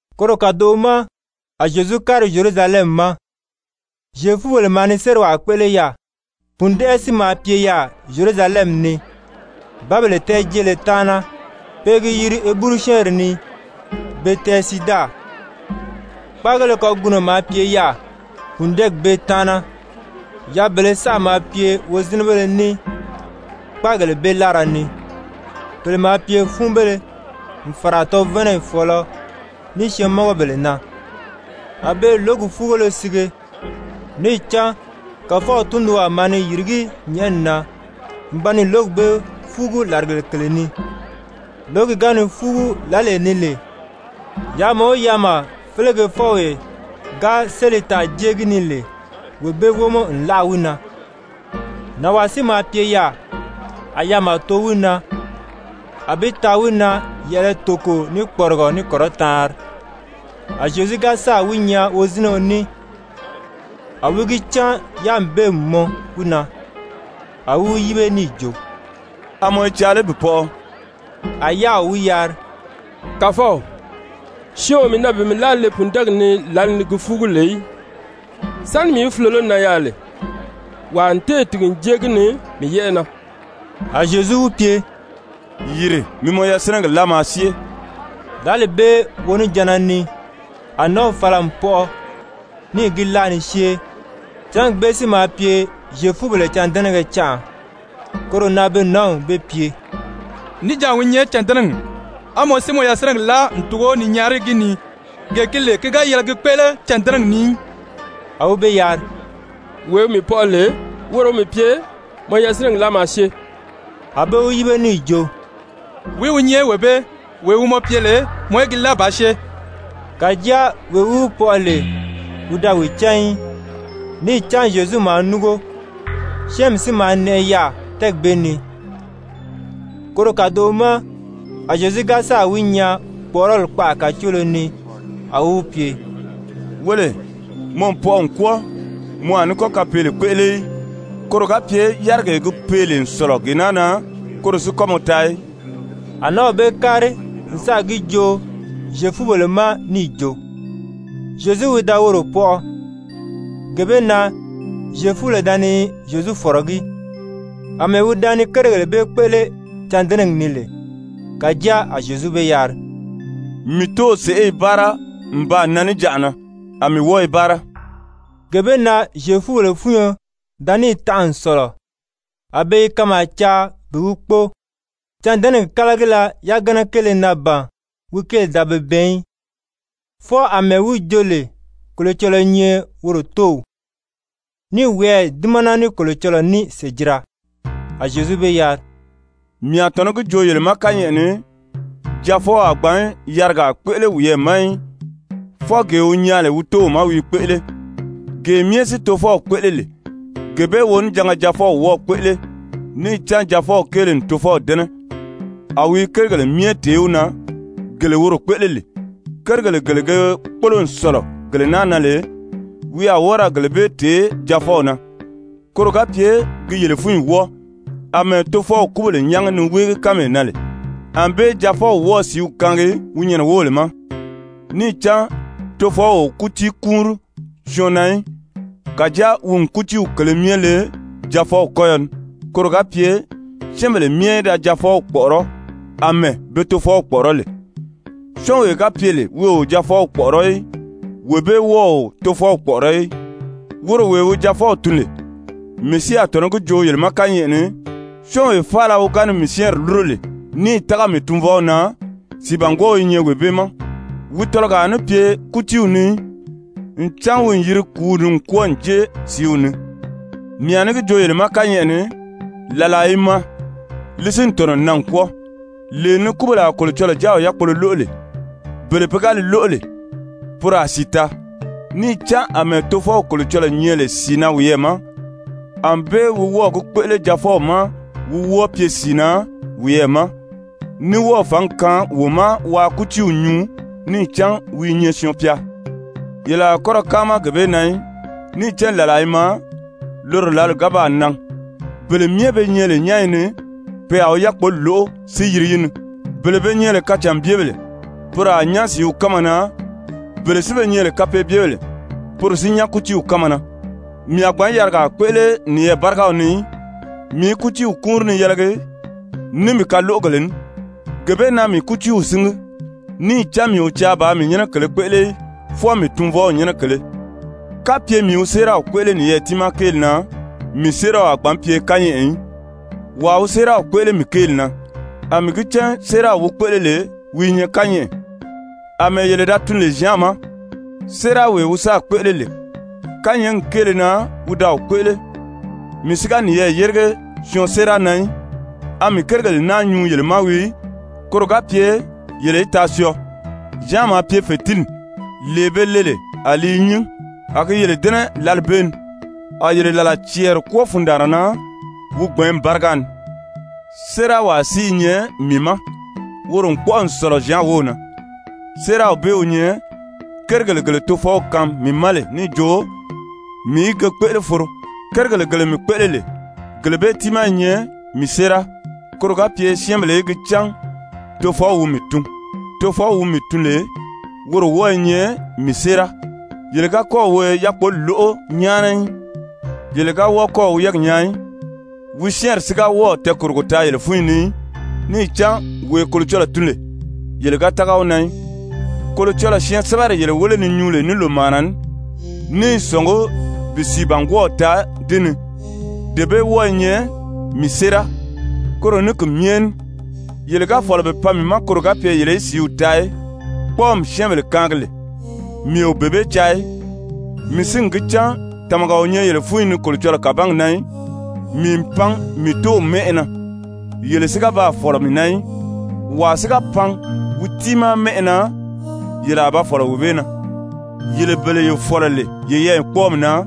Koro kàdoʔo ma a Zyezu kári Zyerusalɛmi ma, Zyefubèle maa ni sériwaa kpéʔele yaà. Pùndɛʔɛ si maa pye yaà Zyerusalɛmi ni, Bǎbèle tɛɛ̀jeele taana, pe i gi yiri Heburu-syɛ́ɛnri ni, Betɛzida. Kpáagéle kagunɔ maa pye yaà pùndɛɛgi bee taana. Yaabèlē saʔa maa pye wozinɛbéle ní kpáagèle bee láara ni, pèle maa pye fúunbéle n fàra tɔvanayi fɔ̀ɔlɔ ní syɛɛnmɔngɔbèle na, [a be i lǒgi fúugolo sige. Níì cán Kàfɔw tundunwaa maa ni yìrigí nyɛ̀ʔɛni na n ba ni lǒgi bee fúugu làrigèle kèle ni. Lǒgi ga ni fúugu lǎlee ni lè, yaama o yaama félegefɔwee ga sélì taa n jée gi ni lè, wee bee wómɔ n láʔa wi na.] Nànwaa si maa pye yaà, a yaama too wi na, a bi taa wi na yɛ̀ʔɛlɛ toko ní kpɔrigɔ ní kɔrɔtaanri. A Zyezu ga sáà wi nyaa wozinɛɔ ní, a wi gi cán yáami bee n mɔn wi na, a wi wi yíbe níì jo: «A mɔ i caa lé bi pɔʔɔ?» A yáaw wi yari: «Kàfɔw, syɔɔn o mii na bi mii láa le pùndɛɛgi ni lǎli ni gi fúugu lè í, sáni si mii í fulolo nan yaà lè, wàa n téè tìgi n jée gi ni mii yɛ́ʔɛ na.» A Zyezu wi pye: «Yìri mi mɔ yasinɛgi láa maa syée.» Lǎli bee wonijanna ni a nǎnw fala n pɔʔɔ níì gi láa ni syée. Cángi bee si maa pye Zyefubèle cândɛnɛgɛ canʔa. Koro na be nǎnw bee pye: «Níjanʔa wi nyɛ cândɛnɛgi, á mɔ si mɔ yasinɛgi láa n tugo ni nyaari gi ni, gee gi lè ki ga yɛlɛ gi kpéʔele cândɛnɛgi ni í.» A wi be yari: «Wee wi mii pɔʔɔ lè, woro wi mii pye: ‹Mɔ yasinɛgi láa maa syée.›» A be wi yíbe níì jo: «Wìí wi nyɛ wee bee, wee wi mɔ pye lè mɔ í gi láa bàā syée?» Kàjáa wee wi wi pɔʔɔ lè, wi da wi cán í. Níì cán Zyezu maa núngo, syɛ́ɛnmi si maa nɛʔɛ yaà tɛ́ɛgi bee ni. Koro kàdoʔo ma a Zyezu ga sáà wi nyaa kpɔ̀ʔɔrɔli kpaʔa kàcoolo ni, a wi wi pye: «Wéle, mɔ n pɔʔɔ n kwɔ́ɔ, mɔ a ní kɔ́ kapeele kpéʔele í, koro ga pye yárigee gi pee lè n sɔ̀lɔ gee naa na, koro si kɔ́ mɔ taa í.» A nǎnw bee kári n sáà gi joo Zyefubèle ma níì jo, Zyezu wi da woro pɔʔɔ. Gee bee na Zyefubèle da ni Zyezu fɔ̀rɔgí, àmɛɛ wi da ni kérigèle bee kpéʔele cândɛnɛgi ni lè. Kàjáa a Zyezu be yari: «Mii Tóow sèʔé i báara n baa nan níjanʔa na, a mii wɔ́ɔ i báara.» Gee bee na Zyefubèle fúnyo da níì tanʔa n sɔ̀lɔ, a be i kanmaa caa bi wi kpóo, cândɛnɛgi kálagila yagana kéele na ban wi kéeli da be bɛɛn í, fwɔɔ àmɛɛ wi jo lè Kolocɔlɔɔ i nyɛ woro Tóow, ní i wiyɛɛ dímana ní Kolocɔlɔɔ ní sèjira. A Zyezu be yari: «Mii a tɔ̀nɔ́ gi joo yele ma kányɛʔɛ ni, Jaafɔw a gbǎn yarigaa kpéʔele wiyɛɛ ma í, fwɔɔ gee wi nyaa lè wi Tóow ma wi i kpéʔele. Gee myɛ si Tofɔw kpéʔele lè, gee bee wonijanga Jaafɔw wɔ́ɔ̄ kpéʔele. Níì cán Jaafɔw kéele n Tofɔw dɛ́nɛ, a wi i kérigèle myɛ tèé wi na, gele woro kpéʔele lè. Kérigèle gele ge kpólo n sɔ̀lɔ gele naa na lè, wi a wɔ́ɔ ra gele bee tèé Jaafɔw na, koro ga pye gi yele fúnyi wɔ́ɔ. Amɛɛ Tofɔw kúbèle nyángi ni wéegi kánmee na lè, ànbée Jaafɔw wɔ́ɔ̄ sìíw kaangi wi nyɛnɛ wóbèle ma. Níì cán Tofɔw o kútii kúunri syɔɔn na í, kàjáa wi n kútiiw kèlē myɛ le Jaafɔw kɔ́yɔ ni, koro ga pye syɛ́ɛnbèle myɛ í da Jaafɔw kpɔ̀ʔɔrɔ́, àmɛɛ be Tofɔw kpɔ̀ʔɔrɔ́ lè. Syɔ́ɔnwee ga pye lè wi o Jaafɔw kpɔ̀ʔɔrɔ́ í, wee bee wɔ́ɔ o Tofɔw kpɔ̀ʔɔrɔ́ í, woro wee wi Jaafɔw tun lè. Mii si a tɔ̀nɔ́ gi joo yele ma kányɛʔɛ ni, syɔ́ɔnwee faala wi ga ni mii syɛ́ɛnri lúro lè níì tága mii Tunvɔw na, sìibangwɔɔw i nyɛ wee bee ma, wi tɔlɔgɔ a ní pye kútiiw ni í, ncan wi n yiri kùúw ni n kwɔ́ɔ n jée sìíw ni. Mii a ní gi joo yele ma kányɛʔɛ ni, làlaa i maa, li si n tɔ̀nɔ n nan n kwɔ́ɔ, lee ni kúbèle a Kolocɔlɔɔ Jáaw yákpolo lóʔo lè. Bele pe ga li lóʔo lè, poro a sìi taa. Níì cán àmɛɛ Tofɔw Kolocɔlɔɔ nyɛ lè sìi na wiyɛɛ ma, ànbée wi wɔ́ɔ̀ gi kpéʔele Jaafɔw ma wi wɔ́ɔ pye sìi na wiyɛɛ ma, ní wɔ́ɔ̀ fǎngi kaan wi ma waa kútiiw nyuu, níì cán wi i nyɛ Syɔɔn-pya. Yele a kɔ́ ra káama gee bee na í. Níì cán làlaa i maa, loro lǎli ga baa nan, bele myɛ be nyɛ lè nyányi ni, pe a wi yákpoli lóʔo si yiri yi ni. Bele be nyɛ lè kacànbyebèle, poro a nyán sìíw kánma na, bele si be nyɛ lè kapeebyebèle, poro si nyán kútiiw kánma na. «Mii a gbǎn yarigaa kpéʔele niyɛɛ bárigaw ni í, mii i kútiiw kúunri ni yɛlɛgi ní mii kaloʔogèle ní. Gee bee na mii kútiiw síngi, níì cán mii o caa bàā mii nyɛ́nɛ kèlē kpéʔele í, fwɔɔ mii Tunvɔw nyɛ́nɛ kèlē. Kapye mii wi séeraw kpéʔele niyɛɛ tiimaa kéeli na, mii séeraw a gbǎn pye kányɛʔɛ í. Wàa wi séeraw kpéʔele mii kéeli na, a mii gi cán séeraw wi kpéʔele lè wi i nyɛ kányɛʔɛ. Amɛɛ yele da tun lè Zyan ma, séerawee wi sáà kpéʔele lè, kányɛɛgi kéele na wi da wi kpéʔele. Mii si ga niyɛɛ yérige syɔɔn séera na í. A mii kérigèle naa nyuu yele ma wii, koro ga pye yele í taa syɔɔ. Zyan maa pye fètinni, lee be le lè a li i nyín, a gi yele dɛ́nɛ lǎli bee ni, a yele làla cɛɛri kwɔ́ɔ fundaanra na wi gbɛ̀ɛ́nmi báriga ni. Séerawaa si ní i nyɛ mii ma, woro n kpɔ́ʔɔ n sɔ̀lɔ Zyan wów na. Séeraw bee wi nyɛ kérigèle gele Tofɔw kaan mii ma lè níì jo mii í ge kpéʔele foro, kérigèle gele mii kpéʔele lè, gele bee tiimaa i nyɛ mii séera, koro ga pye syɛ́ɛnbèle í gi cán Tofɔw wi mii tun. Tofɔw wi mii tun lè, woro wɔ́ɔ i nyɛ mii séera. Yele ga kɔ́ɔ̀ wi yákpoli lóʔo nyáana í, yele ga wɔ́ɔ kɔ́ɔ̀ wi yɛ́ɛgi nyaa í, wi syɛ́ɛnri si ga wɔ́ɔ̀ tɛɛkòrogo taa yele fúnyi ni í, níì cán wee Kolocɔlɔɔ tun lè, yele ga tága wi na í. Kolocɔlɔɔ syɛɛnsɛbɛri yele wéle ni nyuu lè ní lòmaana ní, ní i sɔ̀ngí bi sìibangwɔɔw taa di ni, dee bee wɔ́ɔ i nyɛ mii séera. Koro ní ki myɛ ní yele ga fɔ̀lɔ bi pan mii ma koro ga pye yele í sìíw taa í! Kpɔ́ɔmi syɛ́ɛnbèle kaangi lè, mii o bee bee caa í. Mii si n gi cán tàmaga o nyɛ yele fúnyi ni Kolocɔlɔɔ kàbangi na í. Mii n pan mii Tóow mɛ́ʔɛ na, yele si ga baa fɔ̀lɔ mii na í. Wàa si ga pan wi tiimaa mɛ́ʔɛ na, yele a ba fɔ̀lɔ wee bee na! Yele bele ye fɔ̀lɔ lè yeyɛɛ kpɔ́ɔmi na,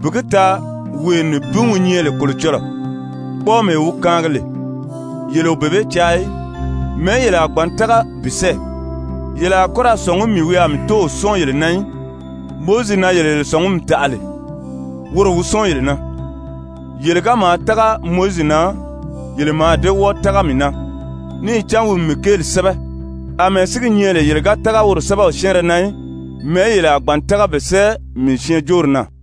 bi gi taa wee nibin wi nyɛ lè Kolocɔlɔɔ, kpɔ́ɔmee wi kaangi lè, yele o bee bee caa í, mɛ̀ɛ́ yele a gbǎn tága bi sɛ́ɛ? Yele a kɔ́ ra sɔ̀ngí mii wi a mii Tóow sɔ́ɔn yele na í. Mowizi na yele ye sɔ̀ngumi taʔa lè, woro wi sɔ́ɔn yele na. Yele ga maa tága Mowizi na, yele mǎà dée wɔ́ɔ tága mii na, níì cán wi n mii kéeli sɛ́bɛ. Amɛɛ si gi nyɛ lè yele ga tága woro sɛ́bɛw syɛ́ɛnrɛ na í, mɛ̀ɛ́ yele a gbǎn tága bi sɛ́ɛ mii syɛɛnjóori na?»